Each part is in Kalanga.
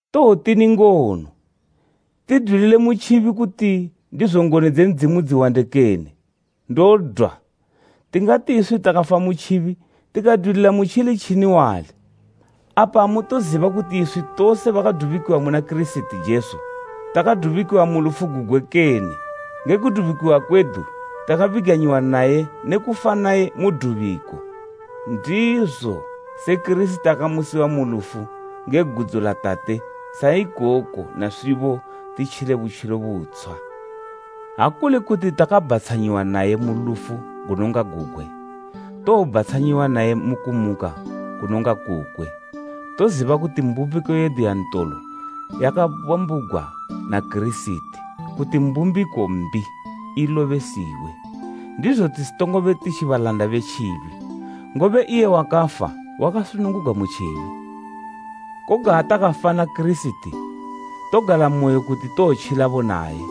Towotini ngono? Tidwilile mu tjibi, kuti ndizo ngoni dze Ndzimu dziwande kene? Ndodwa! Tingati iswi takafa ku tjibi, tikadwilila mutjili tjini wali? Apa amutoziba kuti iswi tose bakadubikiwa muna Kirisiti Jesu, takadubikiwa mu lufu gugwe kene? Nge kudubikiwa kwedu, takabiganyiwa naye ne kufa naye mu dubiko. Ndizo se Kirisiti akamusiwa mu lufu nge gudzo la Tate, sa ikoko naswibo titjile butjilo butshwa. Ha kuli kuti takabhatshanyiwa naye mu lufu gunonga gugwe, towobhatshanyiwa naye mu kumuka kunonga kukwe. Toziba kuti mbumbiko yedu yantolo yakabambugwa na Kirisiti, kuti mbumbiko mbi ilobesiwe, ndizo tisitongobe titji balanda be tjibi, ngobe iye wakafa, wakasunungugwa mu tjibi. Koga ha takafa na Kirisiti, togalamoyo kuti towotjilabo naye,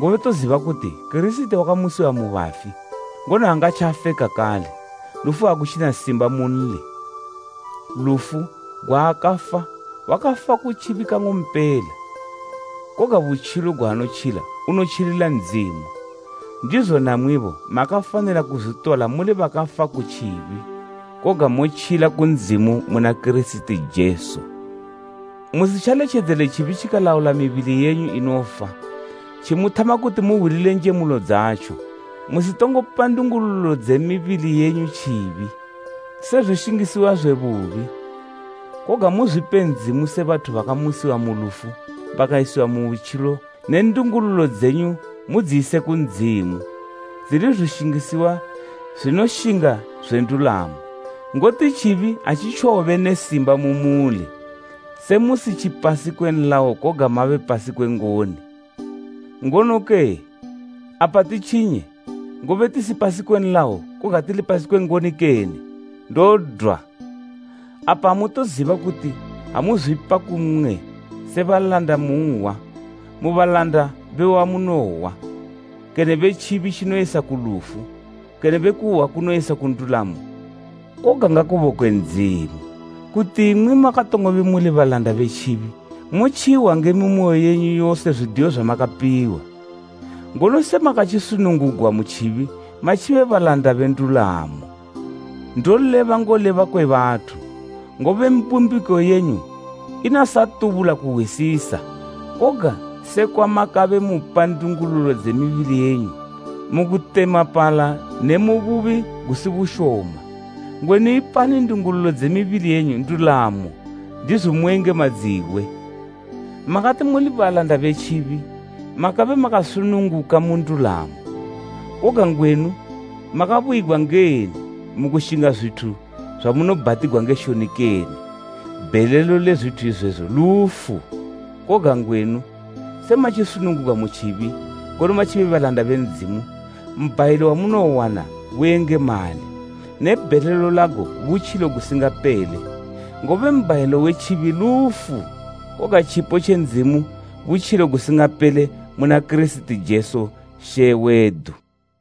ngobe toziba kuti Kirisiti wakamusiwa mu bafi, ngono aangatjafe kakale, lufu agutjina simba munli. Lufu gwaakafa, wakafa ku tjibi kang'ompela. Koga butjilo gwaanotjila unotjilila Ndzimu. Ndizo namwibo makafanila kuzwitola muli bakafa ku tjibi, koga motjila ku Ndzimu muna Kirisiti Jesu. Musitjaletjedzele tjibi tjikalaula mibili yenyu inofa tjimuthama kuti muhwilile njemulo dzatjo. Musitongo pa ndungululo dze mibili yenyu tjibi, se zwishingisiwa zwe bubi, koga muzwipe Ndzimu se bathu bakamusiwa mu lufu bakayisiwa mu butjilo ne ndungululo dzenyu mudziyise ku Ndzimu, dzili zwishingisiwa zwinoshinga zwe ndulamo. Ngoti tjibi atjitjowobe ne simba mu muli, se musitjipasi kwe nlayo koga mabe pasi kwe ngoni. Ngonoke? Apa titjinye, ngobe tisi pasi kwe nlayo koga tili pasi kwe ngoni kene? Ndodwa! Apa amutoziba kuti ha muzwipa ku mmwe se balanda munhwa, mu balanda be wamunohwa, kene be tjibi tjinoyisa ku lufu, kene be kuhwa kunoyisa ku ndulamo? Koga ngakubokwe Ndzimu, kuti imwi makatongobe muli balanda be tjibi, motjihwa nge mimoyo yenyu yose zwidiyo zwamakapiwa. Ngono semakatjisunungugwa mu tjibi matjibe balanda be ndulamo. Ndoleba ngoleba kwe bathu, ngobe mbumbiko yenyu inasatubula kuhwisisa. Koga sekwa makabe mupa ndungululo dze mibili yenyu mu kutemapala ne mu bubi gusibushoma, ngwenu ipani ndungululo dze mibili yenyu ndulamo ndizo muyengemadziwe. Makati muli balanda be tjibi, makabe makasununguka mu ndulamo. Koga ngwenu makabuyigwa ngeni mu kushinga zwithu zwamunobhatigwa nge shoni kene? Bhelelo le zwithu izwezo lufu! Koga ngwenu se matjisunungugwa mu tjibi, ngono matjibe balanda be Ndzimu, mbhayilo wamunowana buyengemali, ne bhelelo lago butjilo gusingapele. Ngobe mbhayilo we tjibi lufu, koga tjipo tje Ndzimu butjilo gusingapele mu na Kirisiti Jesu She wedu.